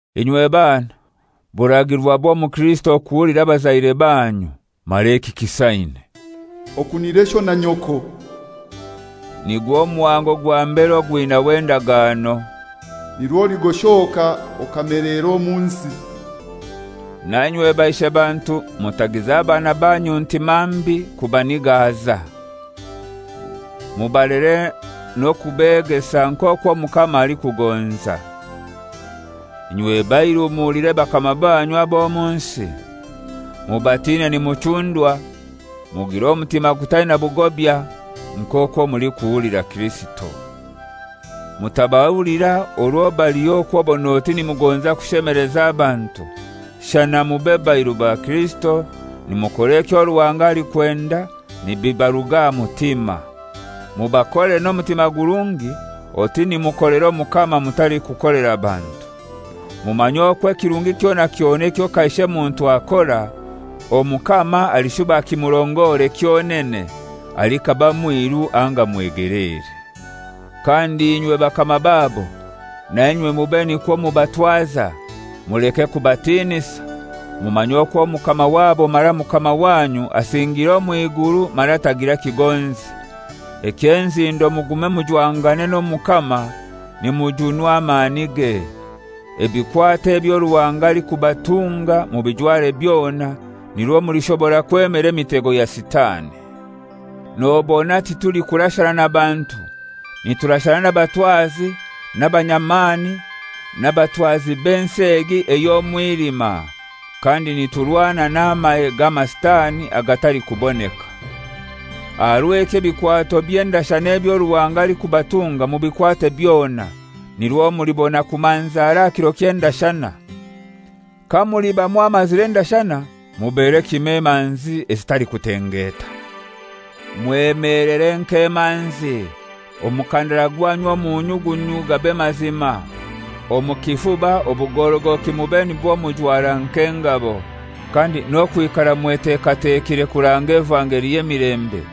Inywe bana, buragirwa bw'omukirisito kuhulira abazaire banyu, mara eki kisaine. «Okunire sho na nyoko» (nigwo muhango gwa mbere ogwinaho endagano), «Nirwo oligoshoka okameleera omu nsi.» Na inywe baishe bantu mutagiza bana banyu ntimambi kubanigaza. Mubalere n'okubegesa nk'okwo Omukama alikugonza. Inywe bairu muhulire bakama banyu ab'omunsi omu. Mubatine nimuchundwa, mugire omutima gutaina bugobya, nk'okwo mulikuhulira Kirisito. Mutabahulira orwo baliho okw'obon'oti nimugonza kushemeleza abantu, shana mube bairu ba Kirisito, nimukora ekyo Ruhanga alikwenda nibibaruga aha mutima. Mubakolere n'omutima gurungi oti nimukolera Omukama mutalikukolera bantu. Mumanye okwo ekirungi kyona kyona ekyo kaishe muntu akora, Omukama alishuba akimurongore kyonene, alikaba mwiru anga mwegeleere. Kandi inywe bakama babo, nainywe mube nikwo mubatwaza, muleke kubatinisa, mumanye okwo Mukama wabo mara Mukama wanyu asingiire omw'iguru, mara tagira kigonzi. Eky'enzindo mugume mujwangane n'Omukama nimujunwa amanige. Ebikwato ebyo Ruhanga alikubatunga mubijware byona, nirwo mulishobora kwemera emitego ya Sitani. Nobona titulikurashana na bantu, niturashana n'abatwazi, n'abanyamani, n'abatwazi b'ensi egi ey'omwilima, kandi niturwana n'amahe g'amasitani agatalikuboneka. Aha rw'ekyo ebikwato by'endashana ebyo Ruhanga alikubatunga mubikwate byona, nirwo mulibona kumanzara aha kiro ky'endashana. Kamuliba mwamazire endashana mubere kimoi emanzi ezitalikutengeta. Mwemelere nk'emanzi, omukandara gwanyu omu nyugunyu gabe mazima, omu kifuba obugorogoki mube nibwo mujwara nk'engabo, kandi okwetegeka kurange evangeli y'emilembe,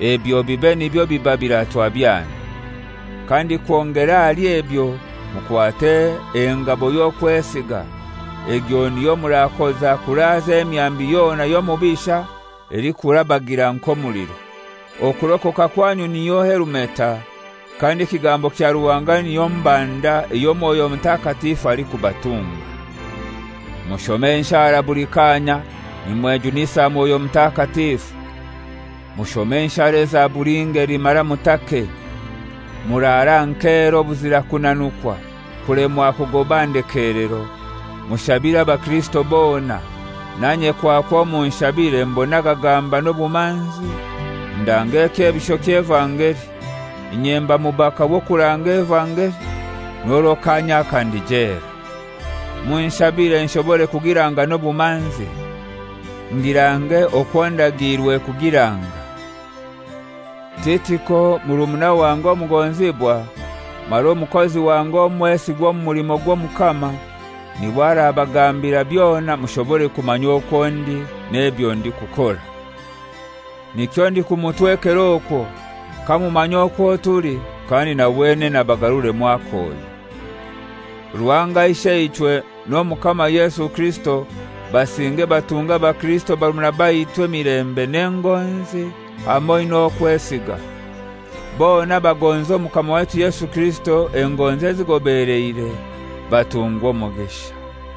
ebyo bibe nibyo biba biratwa byanyu. Kandi kwongera ahali ebyo mukwate engabo y'okwesiga, egyo niyo murakoza kuraaza emyambi yona y'omubisha elikurabagira nk'omuliro. Okurokoka kwanyu niyo helumeta, kandi ekigambo kya Ruhanga niyo mbanda eyo Mwoyo Mutakatifu alikubatunga. Mushome enshara buli kanya nimwejunisa Mwoyo Mutakatifu. Mushome enshara eza buli ngeli mara mutake. Murare aha nkeera obuzira kunanukwa kulemwa kugoba aha ndekelero, mushabire abakirisito bona, nanye kwakwo munshabire mbone agagamba n'obumanzi, ndange ekyebisho ky'evangeli. Inye mba mubaka w'okuranga evangeli, n'orwo kanya aka ndi jela. Munshabire nshobore kugiranga n'obumanzi, ngirange okwo ndagiirwe kugiranga. Titiko murumuna wange omugonzibwa, mara omukozi wange omwesigwa omu mulimo gw'Omukama, n'iwe arabagambira byona mushobore kumanya okwo ndi n'ebyo ndikukora. Nikyo ndikumutwekera okwo, kamumanya okwo tuli, kandi na wenene abagaruremu akoyo. Ruhanga Isheichwe n'Omukama Yesu Kirisito basinge batunge abakirisito barumuna baitu emilembe n'engonzi hamoi n'okwesiga. Bona abagonza Omukama waitu Yesu Kirisito engonzi ezigobeleire, batungwe omugisha.